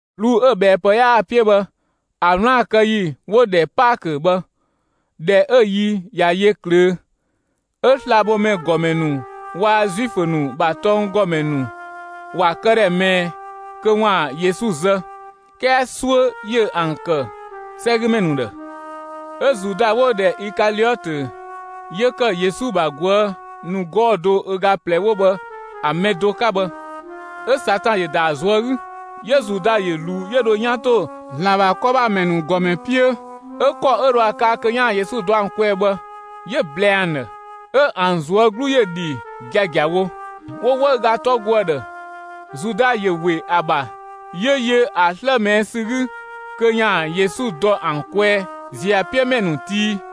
'Bluu‑ 'ö‑ ꞊bhɛɛpë 'yaa‑ 'piö bhë ‑a 'wlaan‑ kë ‑yi 'wo‑ ‑dhɛ Paakö bhë, ꞊dhɛ 'ö‑ yi ꞊ya yö ꞊klöö', 'Ö slabhomɛ ‑gɔmɛ ‑nu waa‑ Zuifö ‑nu ‑bha tɔnggɔmɛ ‑nu ‑wa këdhɛ ꞊mɛɛ kö 'waan‑ Yesu zë, 'kɛɛ 'suö ‑yö ‑an ‑kë 'sɛgümɛ ‑nu ‑dhë. 'Ö Zuda 'wo‑ ‑dhɛ Ikaliɔtö, 'yö ‑kë Yesu ‑bha ꞊guë' ‑nu 'gɔɔ‑ do ö ga ꞊plɛ 'wo bhë ‑a mɛ do 'ka bhë, 'ö Satan ‑yö ‑da ‑a ꞊zuö' 'gü. 'Yö Zuda ‑yö ‑luu 'yö dho 'yan ‑to ‑Zlan ‑bha 'kɔ ‑bha ‑mɛ ‑nu ‑gɔmɛ 'piö 'ö ‑kɔ 'ö dhoë kaa kö 'yaan‑ Yesu dɔ ‑an kwɛɛ bhë, 'yö‑ ꞊blɛɛ ‑an ‑dhë. 'Ö ‑an ꞊zuö' 'glu ‑yö ‑dhi giagiawo, 'wo 'wëüga 'tɔ go ‑a ‑dhë. Zuda ‑yö ‑we ‑a ‑bha; 'yö yö ‑a 'slë ꞊mɛɛ' ‑sü 'gü kö ‑yaan Yesu dɔ ‑an kwɛɛ ‑ziö ‑a 'piö ‑mɛ ‑nu tii.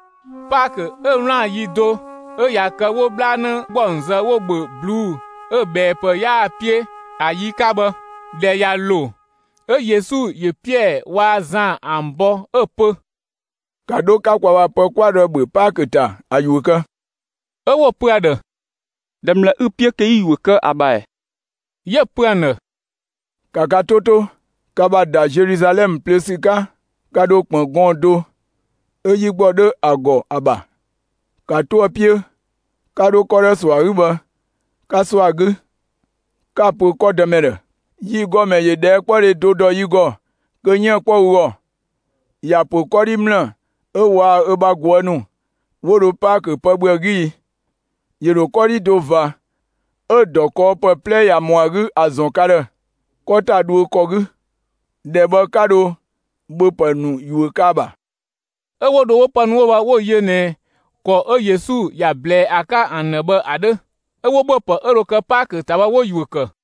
Paakö 'ö 'wlaan‑ ‑yi do 'ö ꞊ya kë 'wo 'bhlanë ‑gbɔng zë 'wo‑ ‑bhö ꞊bluu'‑ 'ö‑ ꞊bhɛɛpë 'yaa‑ 'piö ‑a yi 'ka bhë, ꞊dhɛ ꞊ya ‑lo, 'Ö Yesu ‑yö Piɛɛ waa‑ Zan ‑an bɔ 'ö‑ pö: «‑Ka 'dho 'ka kwa ‑bha pë 'kwa dho ‑a ‑bhö Paakö ‑ta, ‑a ‑yuö kë!» 'Ö 'wo‑ pö ‑a ‑dhë: «꞊Dhɛ ‑mlë 'ü‑ 'piö kö 'yi‑ ‑yuö kë ‑a ‑bha ‑ɛ?» 'Yö‑ pö ‑an ‑dhë: «‑Ka ka 'to 'to! Ka ‑bha ‑da Zeluzalɛmë plöö ‑sü 'ka, ka ‑dho ‑kpën gɔɔn‑ do 'ö 'yi ‑gbɔ 'dho ‑a ‑gɔ ‑a ‑bha. ‑Ka 'to ‑a 'piö, 'ka 'dho 'kɔ 'ö 'dhoë‑ ‑sɔ ‑a 'gü bhë, 'ka ‑sɔ ‑a 'gü 'ka‑ pö 'kɔ dëmɛ ‑dhë: ‹Yi ‑gɔmɛ ‑yö ꞊dhɛɛkpɔdhe do ‑dɔ yi ‑gɔ kö 'yiën‑ ‑a 'kpɔ ü ‑gɔ; ‑ya ‑pö 'kɔdhi ‑mlë 'ö waa‑ ö ‑bha ꞊guë' ‑nu 'wo dho Paakö ‑pë ‑bhö ‑a 'gü i?› ‑Yö ‑dho 'kɔdhi do ꞊va 'ö ‑dɔ kɔɔpë 'plɛ ꞊ya ‑mɔ ‑a 'gü ‑a ‑zɔn ka ‑dhë 'kɔ ‑ta dhuö ‑kɔ 'gü. ‑Dhɛ bhë 'ka dho ‑bhöpë ‑nu ‑yuö kë ‑a ‑bha.» 'Ö 'wo dho 'wo pë ‑nu 'wo bhë 'wo ‑an yö ꞊nɛ ‑kɔ 'ö Yesu ‑ya ꞊blɛɛ ‑a 'ka ‑an ‑dhë bhë ‑a 'dhö; 'ö 'wo ‑bhöpë 'ö dho kë Paakö ‑ta bhë 'wo‑ ‑yuö ‑kë.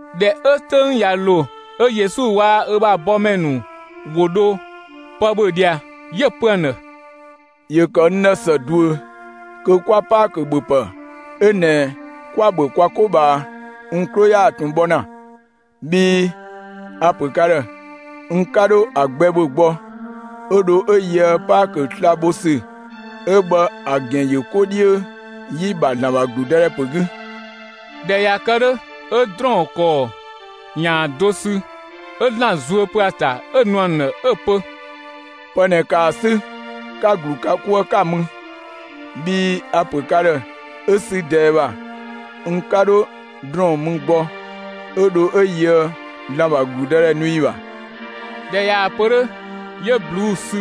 ꞊Dhɛ 'ö 'töng ꞊ya ‑lo, 'ö Yesu waa‑ ö bha bɔmɛ ‑nu ‑wo dho pë ‑bhö ꞊dhia, 'yö‑ pö ‑an ‑dhë: «‑Yö ‑kë n ‑dhë ‑së ꞊duö kö 'kwa Paakö ‑bhöpë 'ö ꞊nɛ 'kwa‑ ‑bhö kwa 'ko ꞊bhaa n 'klo yaa ꞊tun bhɔ ‑na. Bhii a‑ ‑pö ka ‑dhë: N 'ka 'dho ‑a gbɛ ‑bhö gbɔ 'ö dho 'ö yöë Paakö sla‑ bho ‑sü 'ö bhë ‑a ‑gɛn ‑yö 'ko 'dhiö ‑yi ‑bha ‑Zlan ‑bha ‑gludëdhɛ ‑pö 'gü.» ꞊Dhɛ ꞊ya kë 'dhö, 'ö ‑drɔɔn ‑kɔɔ ‑yaan do sü 'ö ‑Zlan zuö pö ‑a ‑ta 'ö‑ nu ‑an ‑dhë 'ö‑ pö: «Pë ꞊nɛ, ‑kaa ‑a 'sü 'ka‑ ‑glu ka 'kuë 'ka‑ mü, bhii a‑ ‑pö ka ‑dhë 'ö sü ꞊dɛɛ ‑bha n 'ka 'dho ‑drɔɔn mü gbɔ 'ö dho 'ö yöë ‑Zlan ‑bha ‑gludëdhɛ nu ‑yi ‑bha.» ꞊Dhɛ ꞊yaa‑ pö 'dhö, 'yö 'bluu‑ sü;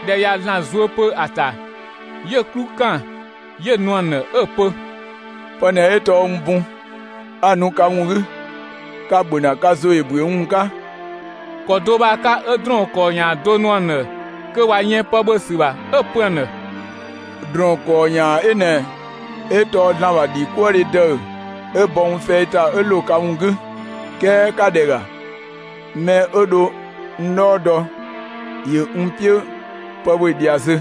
꞊dhɛ ꞊ya ‑Zlan zuö pö ‑a ‑ta, 'yö‑ 'klu ‑kan 'yö‑ nu ‑an ‑dhë 'ö‑ pö: «Pë ꞊nɛ tɔɔ n bun, 'a‑ nu ka ‑wun 'gü. Ka‑ ‑bhö ‑na, ka ‑zo ‑yö ‑büö n ‑wun 'ka!» ‑Kɔ do bhë ‑a 'ka; 'ö ‑drɔɔn ‑kɔɔ ‑yaan do nuë ‑an ‑dhë kö ꞊wa yën pë ‑bhö ‑sü ‑bha, 'ö‑ pö ‑an ‑dhë: «‑Drɔɔn ‑kɔɔ ‑yaan 'ö ꞊nɛ 'ö tɔɔ ‑Zlan ‑bha ‑dhikuëdhe ‑dëü 'ö bɔ n fɛi ‑ta 'ö ‑lo ka ‑wun 'gü. 'Kɛɛ ‑ka ‑dhɛ ‑ga, mɛ 'ö dho n 'dhɔɔ dɔ, ‑yö n 'piö pë ‑bhö ꞊dhia zö!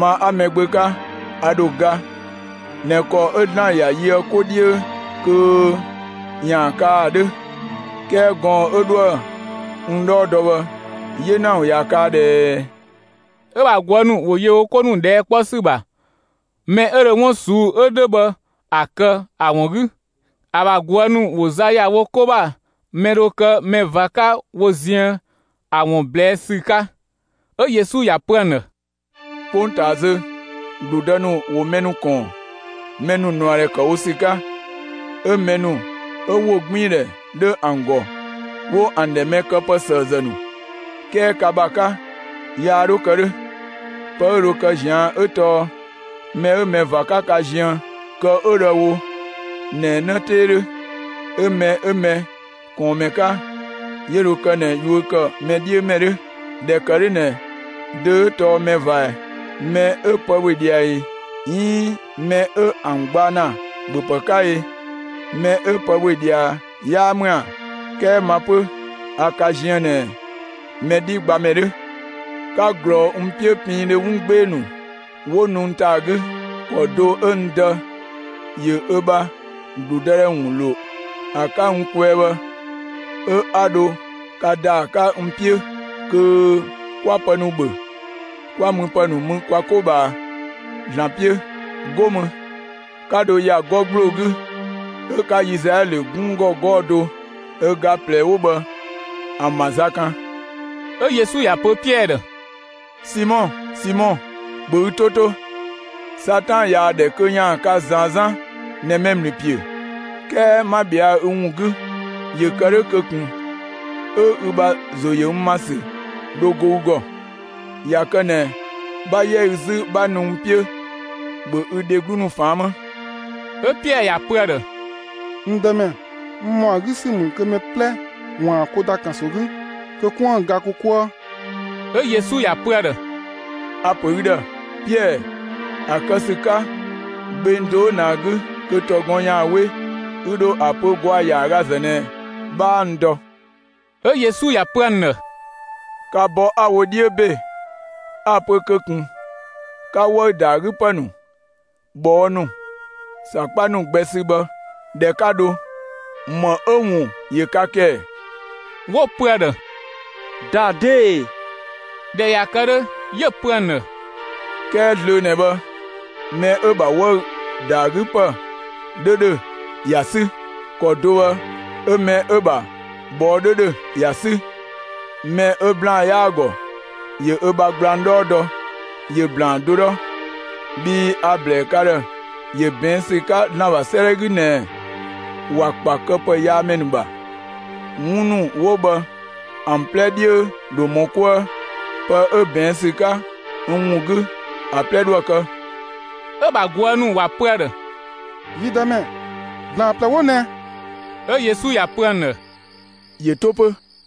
Ma 'a Mɛgbö 'ka, a ‑dho ga ꞊nɛ ‑kɔ 'ö ‑Zlan ‑ya yö ‑a 'ka 'ko 'dhiö kö ‑yaan kaa ‑a 'dhö; 'kɛɛ gɔɔn‑ 'ö 'dhoë‑ n 'dhɔɔ dɔ bhë 'yena ‑wun ꞊ya kaa ꞊dhɛɛ!» 'Ö‑ ‑bha ꞊guë' ‑nu ‑wo yö wo 'ko ‑nu ꞊dhɛɛ' 'kpɔ ‑sü ‑bha, mɛ 'ö dho 'wun ꞊suu'‑ 'ö 'dhö bhë ‑a kë ‑a ‑wun 'gü. ‑A ‑bha ꞊guë' ‑nu ‑wo za ‑ya wo 'ko ‑bha, mɛ dho kë mɛ ꞊va 'ka wo ziën ‑a ‑wun ꞊blɛɛ' ‑sü 'ka. 'Ö Yesu ‑ya pö ‑an ‑dhë: «'Kpongtaa zö, ‑gludë ‑nu ‑wo mɛ ‑nu ‑kɔɔn, mɛ ‑nu ꞊nuadhɛ ‑kë wo ‑sü 'ka, 'ö mɛ ‑nu 'ö ‑wogbiindhɛ 'dho ‑an ‑gɔ, 'wo ‑an ‑dhɛ mɛ këpësëëzë ‑nu, 'kɛɛ ka ‑bha 'ka, yaa 'dho kë 'dhö. Pë 'ö dho kë ꞊zian' 'ö tɔɔ mɛ 'ö mɛ ꞊va 'ka ka ziën, kë 'ö dho ‑a wo ꞊nɛ 'në 'tee 'dhö; 'ö mɛ 'ö mɛ ꞊kɔɔnmɛ 'ka, 'yö dho kë ꞊nɛ yuö ‑kë mɛ 'dhiö ‑mɛ 'dhö. ꞊Dhɛ ‑kë 'dhö ꞊nɛ dö 'ö tɔɔ mɛ ꞊va ꞊ɛ? Mɛ 'ö pë ‑bhö ꞊dhia ꞊i, 'iin mɛ 'ö ‑an gbaa ‑na ‑bhöpë 'ka i? Mɛ 'ö pë ‑bhö ꞊dhia 'yaa ‑mü ‑a? 'Kɛɛ ma 'pö, a ka ziën ꞊nɛ mɛ 'dhi gbamɛ 'dhö. 'Ka ꞊glɔɔ n 'piö piindhö 'wun 'gbee‑ ‑nu 'wo nu n ‑ta ‑a 'gü. ‑Kɔ do 'ö n Dë ‑yö ö ‑bha ‑gludëdhɛ ‑wun ‑lo ‑a 'ka n kwɛɛ bhë, 'ö 'a dho ka ‑da ‑a 'ka n 'piö, kö 'kwa pë ‑nu ‑bhö, 'kwa müpë ‑nu mü kwa 'ko ꞊bhaa ‑Zlan 'piö; 'go mü 'ka dho ‑ya 'gɔ ‑gbloo 'gü 'ö 'ka Izlaɛlö 'gunng ‑gɔ 'gɔɔ‑ do ö ga ꞊plɛ 'wo bhë ‑an ‑bha za kan.» 'Ö Yesu ‑ya pö Piɛɛ ‑dhë: «Simɔ, Simɔ, ‑bhö ü 'to 'to! Satan ꞊yaa‑ ‑dhɛ kö ‑yaan ka ꞊zaan 'zan ꞊nɛ mɛ ‑mlü ‑piö, 'kɛɛ 'ma ꞊bhɛa'‑ ü ‑wun 'gü, ‑yö kë 'dhö kö ꞊kun 'ö ü ‑bha ‑zo ‑yö n ‑ma ‑sü dho go ü ‑gɔ. ꞊Ya kë ꞊nɛ 'bha 'yɛ ü 'zü 'bha nu n 'piö, ‑bhö ü dheglu ‑nu ꞊faan' 'më!» 'Ö Piɛɛ ‑ya pö ‑a ‑dhë: «N Dëmɛ, n ‑mɔ ‑a 'gü ‑sü ‑mü kö mɛ 'plɛ ‑waan ko ‑da ‑kanso 'gü kö 'koën‑ ga ko 'kuë.» 'Ö Yesu ‑ya pö ‑a ‑dhë: «A‑ ‑pö ü ‑dhë, Piɛɛ, ‑a kë ‑sü 'ka gbeng do 'ö ꞊nɛ ‑a 'gü kö ‑tɔgɔn ‑yaan 'we, ü ‑dho ‑a pö ‑gwaa ‑yaagazë ꞊nɛ 'bhaa n dɔ.» 'Ö Yesu ‑ya pö ‑an ‑dhë: «Ka bɔ 'a‑ wo 'dhiö ‑be, 'a‑ pö kö ꞊kun 'ka 'wëü‑ ‑da ‑a 'gü ‑pë ‑nu, ꞊bhɔɔ' ‑nu, ‑sakpa ‑nu gbɛ sü bhë, ꞊dhɛ 'ka 'dho, ‑më 'ö‑ ‑wun ‑yö ka ‑kë ‑ɛ?» 'Wo‑ pö ‑a ‑dhë: «‑Daa 'dee‑!» ꞊Dhɛ ꞊ya kë 'dhö, 'yö‑ pö ‑an ‑dhë: «'Kɛɛ zlöö ꞊nɛ bhë, mɛ 'ö‑ ‑bha 'wëü‑ ‑da ‑a 'gü ‑pë 'dhö ‑dhö ‑ya 'sü. ‑Kɔ do bhë 'ö mɛ 'ö‑ ‑bha ꞊bhɔɔ' 'dhö ‑dhö ‑ya 'sü, mɛ 'ö ‑blaan 'yaa‑ ‑gɔ, ‑yö ö bha gblang 'dhɔɔ dɔ, ‑yö ‑blaan do 'dhɔ! Bhii a‑ ‑blɛɛ ka ‑dhë ‑yö ꞊bɛɛn' ‑sü 'ka ‑Zlan ‑bha 'sëëdhɛ 'gü ꞊nɛɛ: ‑Wa ‑kpa këpëyaamɛ ‑nu ‑bha. 'Wun ‑nu 'wo bhë ‑an 'plɛ 'dhiö ‑dho ‑mɔ 'kuë; pë 'ö ꞊bɛɛn' ‑sü 'ka n ‑wun 'gü, ‑a 'plɛ 'dhoë‑ kë.» 'Ö‑ ‑bha ꞊guë' ‑nu ‑wa pö ‑a ‑dhë: «Yi Dëmɛ, ‑blaan ꞊plɛ 'wo ꞊nɛ!» 'Ö Yesu ‑ya pö ‑an ‑dhë: «‑Yö 'to 'pö.»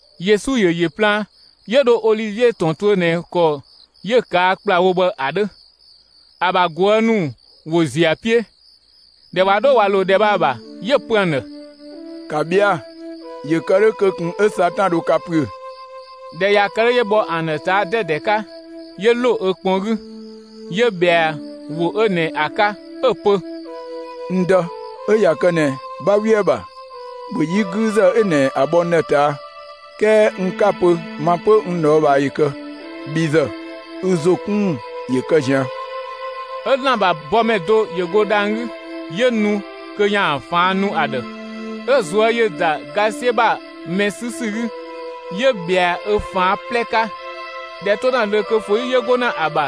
Yesu ‑yö ‑yö plaan, 'yö dho Olivie ‑tɔn tuö ꞊nɛ ‑kɔ 'yö‑ ꞊kaa' ‑kplawo bhë ‑a 'dhö. ‑A ‑bha ꞊guë' ‑nu ‑wo ‑ziö ‑a 'piö. ꞊Dhɛ ꞊wa 'dho ꞊wa ‑lo ‑dhɛ bhë ‑a ‑bha, 'yö‑ pö ‑an ‑dhë: «‑Ka ꞊bhɛa'‑, ‑yö ‑kë 'dhö kö ꞊kun 'ö Satan dho ka ‑püö!» ꞊Dhɛ ꞊ya kë 'dhö, 'yö bhɔ ‑an ‑dhë ꞊taa' 'dɛdɛ 'ka, 'yö ‑lo ö kpɔn 'gü 'yö ꞊bhɛa ‑wo 'ö ꞊nɛ ‑a 'ka 'ö‑ pö: «N Dë, 'ö ꞊ya kë ꞊nɛ 'bha 'we ‑a ‑bha, ‑bhö 'yi 'güüzë 'ö ꞊nɛ ‑a bhɔ n ‑dhë ꞊taa', 'kɛɛ n 'ka‑ pö ma 'pö n ꞊dhɔɔbhaa ‑yö kë, bhi ‑zë, ü ‑zo 'kun ‑wun ‑yö kë ꞊zian'!» ['Ö ‑Zlan ‑bha bɔmɛ do ‑yö go dhang‑ 'gü 'yö nu kö ‑yaan ꞊faan' nu ‑a ‑dhë.] 'Ö‑ ꞊zuö' ‑yö ‑da ga 'siö ‑bha mɛ 'sü ‑sü 'gü, 'yö ‑bhɛa ö ꞊faan' 'plɛ 'ka, ꞊dhɛ 'to ‑na zlöö kö föyi 'yö go ‑na ‑a ‑bha,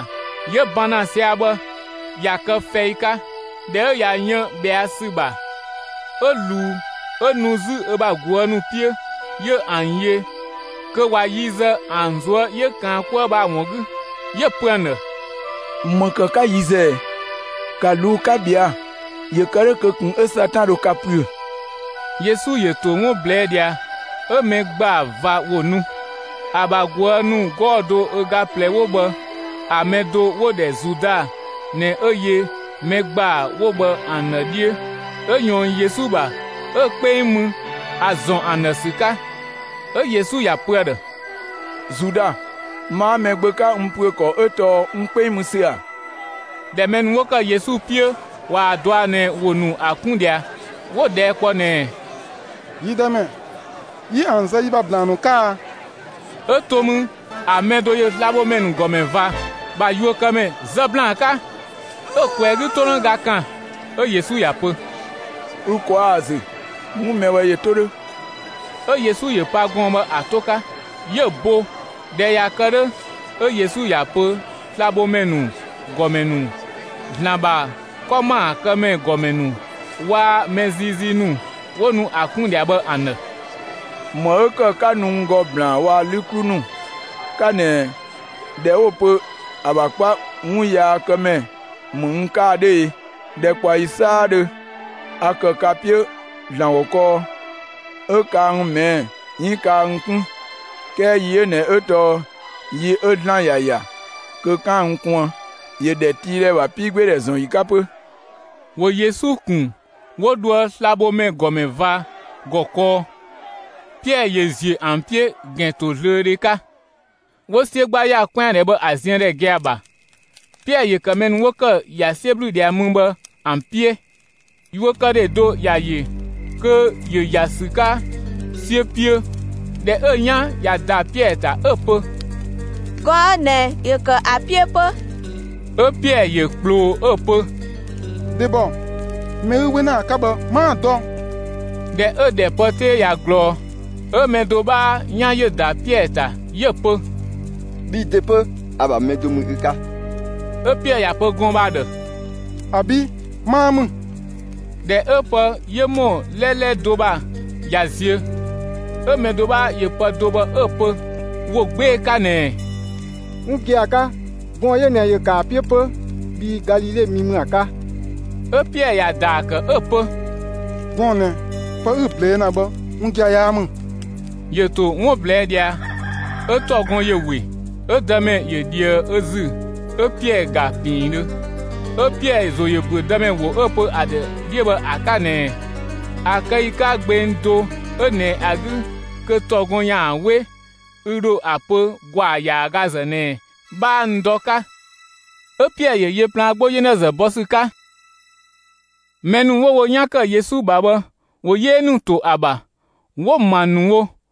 'yö ban ‑na sia‑ bhë, ꞊ya kë fɛi 'ka. ꞊Dhɛ 'ö ꞊ya yën ꞊bhɛa' ‑sü ‑bha, 'ö ꞊luu 'ö nu 'zü ö bha ꞊guë' ‑nu 'piö, 'yö ‑an yö kö ꞊wa yi zë ‑an ꞊zuö' 'yö ‑kaan 'kuë bhë ‑a ‑wun 'gü, 'yö‑ pö ‑an ‑dhë: «‑Më ‑kë 'ka yi zë ꞊ɛ? ‑Ka ꞊luu'‑ 'ka ꞊bhɛa'‑, ‑yö kë 'dhö kö ꞊kun 'ö Satan dho ka ‑püö!» Yesu ‑yö ‑to 'wun ꞊blɛɛ' ꞊dhia, 'ö mɛ ‑gbaa ꞊va ‑wo nu. ‑A ‑bha ꞊guë' ‑nu 'gɔɔ‑ do ö ga ꞊plɛ 'wo bhë ‑a mɛ do 'wo‑ ‑dhɛ Zuda ꞊nɛ 'ö yö mɛ ‑gbaa 'wo bhë ‑an ‑dhë 'dhiö, 'ö ꞊yɔɔn Yesu ‑bha 'ö‑ 'kpeng mü (‑a ‑zɔn ‑an ‑dhë ‑sü 'ka). 'Ö Yesu ‑ya pö ‑a ‑dhë: «Zuda, ma 'a Mɛgbö 'ka n ‑püö ‑kɔ 'ö tɔɔ n 'kpeng mü ‑sü ‑a?» ꞊Dhɛ mɛ ‑nu 'wo ‑kë Yesu 'piö ꞊waa‑ dɔa ꞊nɛ ‑wo ‑nu ‑a 'kun ꞊dhia, 'wo‑ ꞊dhɛɛ' kpɔ ꞊nɛɛ: «Yi Dëmɛ, 'yi ‑an ‑zë yi ‑bha ‑blaan ‑nu 'ka a?» 'Ö to mü ‑a mɛ do ‑yö slabhomɛ ‑nu ‑gɔmɛ ꞊va ‑bha yuökëmɛ zë ‑blaan 'ka, 'ö‑ ꞊kwɛɛ‑ 'gü 'tonëga ‑kan. 'Ö Yesu ‑ya pö: «Ü ꞊kwaa' ‑a ‑zü, 'wun mɛ bhë ‑yö 'to 'dhö!» 'Ö Yesu ‑yö pa gɔɔn‑ bhë ‑a 'to 'ka 'yö‑ bo. ꞊Dhɛ ꞊ya kë 'dhö, 'ö Yesu ‑ya pö slabhomɛ ‑nu ‑gɔmɛ ‑nu, ‑Zlan ‑bha 'kɔ ‑maakëmɛ ‑gɔmɛ ‑nu, waa‑ mɛ ziizii ‑nu, 'wo nu ‑a 'kun ꞊dhia bhë ‑an ‑dhë: «‑Më 'ö ‑kë 'ka nu n ‑gɔ ‑blaan waa‑ 'lü 'klu ‑nu 'ka ꞊nɛ ꞊dhɛ 'wo‑ pö ‑a ‑bha 'kpa 'wunyaakëmɛ ‑mü n 'ka ‑a 'dhö e? ‑Dhɛkpaɔyi 'saadhö a ‑kë ka 'piö ‑Zlan ‑gɔ kɔɔ, 'ö kaa n ꞊mɛɛ' 'iin kaa n 'kun; 'kɛɛ yi 'ö ꞊nɛ 'ö tɔɔ yi 'ö ‑Zlan ‑ya ‑ya kö 'kaan‑ n kuën, ‑yö ‑dhɛtiidhɛ ‑bha 'piigbeedhɛ ‑zɔn ‑yi 'ka 'pö.» ‑Wo Yesu ‑kun 'wo dhoë slabhomɛ ‑gɔmɛ ꞊va ‑gɔ kɔɔ. Piɛɛ ‑yö ‑ziö ‑an 'piö ‑gɛntozlöödhe 'ka. ‑Wo 'siö 'gba ‑ya 'kwɛandhɛ bhë ‑a ziëndhɛ gia‑ ‑bha. Piɛɛ ‑yö ‑kë mɛ ‑nu 'wo ‑kë ‑ya 'siö ‑blü ꞊dhia mü bhë ‑an 'piö. Yuökëdhe do ‑ya ‑yö kö ‑yö ‑ya ‑sü 'ka 'siö 'piö. ꞊Dhɛ 'ö‑ 'yan ꞊ya ‑da Piɛɛ ‑ta, 'ö‑ pö: «Gɔɔn‑ 'ö ꞊nɛ ‑yö ‑kë ‑a 'piö 'pö!» 'Ö Piɛɛ ‑yö ꞊kploo 'ö‑ pö: «Dhebɔ, mɛ 'ü 'we ‑na ‑a 'ka bhë 'maa‑ dɔ!» ꞊Dhɛ 'ö‑ ‑dhɛ pë 'tee ꞊ya ꞊glɔɔ, 'ö mɛ do 'bhaa 'yan ‑yö ‑da Piɛɛ ‑ta, 'yö‑ pö: «Bhi ‑de 'pö, ‑a ‑bha mɛ do ‑mü ü 'ka!» 'Ö Piɛɛ ‑ya pö gɔɔn‑ bhë ‑a ‑dhë: «‑Abi', 'maa ‑mü!» ꞊Dhɛ 'ö pë 'yö ‑mɔ 'lɛlɛ do ‑bha ꞊ya ziö, 'ö mɛ do 'bhaa ‑yö pë do bhë 'ö‑ pö ‑wo 'gbee‑ 'ka ꞊nɛɛ: «'Wun gia‑ 'ka, gɔɔn‑ 'ö ꞊nɛ ‑yö ‑kë ‑a 'piö 'pö, bhii Galile mi ‑mü ‑a 'ka!» 'Ö Piɛɛ ‑ya ‑daa ‑kë 'ö‑ pö: «Gɔɔn‑ ꞊nɛ, pë 'ü‑ ꞊blɛɛ' ‑na bhë 'wun gia‑ 'yaa ‑mü!» ‑Yö ‑to 'wun ꞊blɛɛ' ꞊dhia 'ö ‑tɔgɔn ‑yö ‑we. 'Ö Dëmɛ ‑yö ꞊dhië ö ‑zü 'ö Piɛɛ ‑ga piindhö. 'Ö Piɛɛ ‑zo ‑yö ‑büö Dëmɛ ‑wo 'ö‑ pö ‑a ‑dhë 'dhiö bhë ‑a 'ka ꞊nɛɛ «‑a kë ‑yi 'ka gbeng do 'ö ꞊nɛ ‑a 'gü kö ‑tɔgɔn ‑yaan 'we, ü ‑dho ‑a pö ‑gwaa ‑yaagazë ꞊nɛ 'bhaa n dɔ» 'ka. 'Ö Piɛɛ ‑yö yö plaan 'gbo 'yenazë bɔ ‑sü 'ka. Mɛ ‑nu 'wo wo 'yan ‑kë Yesu ‑bha bhë, ‑wo 'yee ‑nu ‑to ‑a ‑bha 'wo‑ ‑ma ‑nu wo,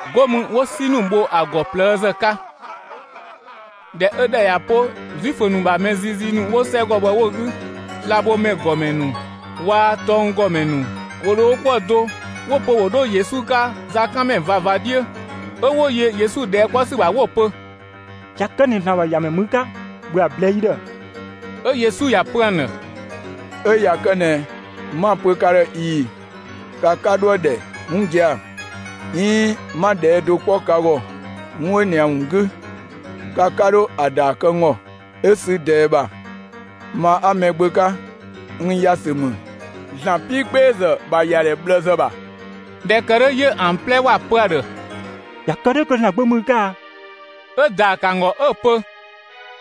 'Go mü 'wo 'si ‑nu bho ‑a ‑gɔ ꞊plëëzë 'ka. ꞊Dhɛ 'ö ‑dhɛ ꞊ya 'po, Zuifö ‑nu ‑bha mɛ ziizii ‑nu 'wo 'sɛgɔ bhë 'wo‑ 'gü, slabhomɛ ‑gɔmɛ ‑nu waa‑ tɔnggɔmɛ ‑nu ‑wo ‑dho wo 'kuë‑ do 'wo‑ pö ‑wo 'dho Yesu 'ka zakanmɛ ꞊vava 'dhiö. 'Ö 'wo yö Yesu ꞊dhɛɛ' 'kpɔ ‑sü ‑bha 'wo‑ pö: «꞊Ya kë ꞊nɛ ‑Zlan ‑bha ‑Yamɛ ‑mü ü 'ka, ‑bhö ‑a ꞊blɛɛ'‑ yi ‑dhë!» 'Ö Yesu ‑ya pö ‑an ‑dhë: «'Ö ꞊ya kë ꞊nɛ 'ma‑ pö ka ‑dhë ꞊ii‑, ka 'ka 'dhoë‑ ‑dhɛ 'wun gia‑, 'iin 'ma ꞊dhɛɛ' do 'kpɔ ka ‑gɔ 'wun 'ö ꞊nɛ ‑a ‑wun 'gü, ka 'ka 'dho ‑a ‑daa kë n ‑gɔ. 'Ö sü ꞊dɛɛ ‑bha, ma 'a Mɛgbö 'ka, n ‑ya ‑sü ‑mü ‑Zlan 'piigbeezë ‑bha ‑yadhɛ ꞊bhlëzë ‑bha.» ꞊Dhɛ ‑kë 'dhö 'yö ‑an 'plɛ ‑wa pö ‑a ‑dhë: «꞊Ya kë 'dhö kö ‑Zlan Gbö ‑mü ü 'ka a?» 'Ö‑ ‑daa ‑kë ‑an ‑gɔ 'ö‑ pö: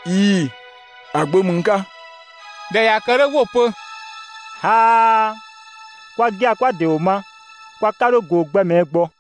«꞊Ii‑, ‑a Gbö ‑mü n 'ka.» ꞊Dhɛ ꞊ya kë 'dhö, 'wo‑ pö: «꞊Aa! Kwa gia‑ 'kwa‑ ‑de ‑wo ma; kwa 'ka 'dho ꞊goo‑ gbɛ ꞊mɛɛ' gbɔ!»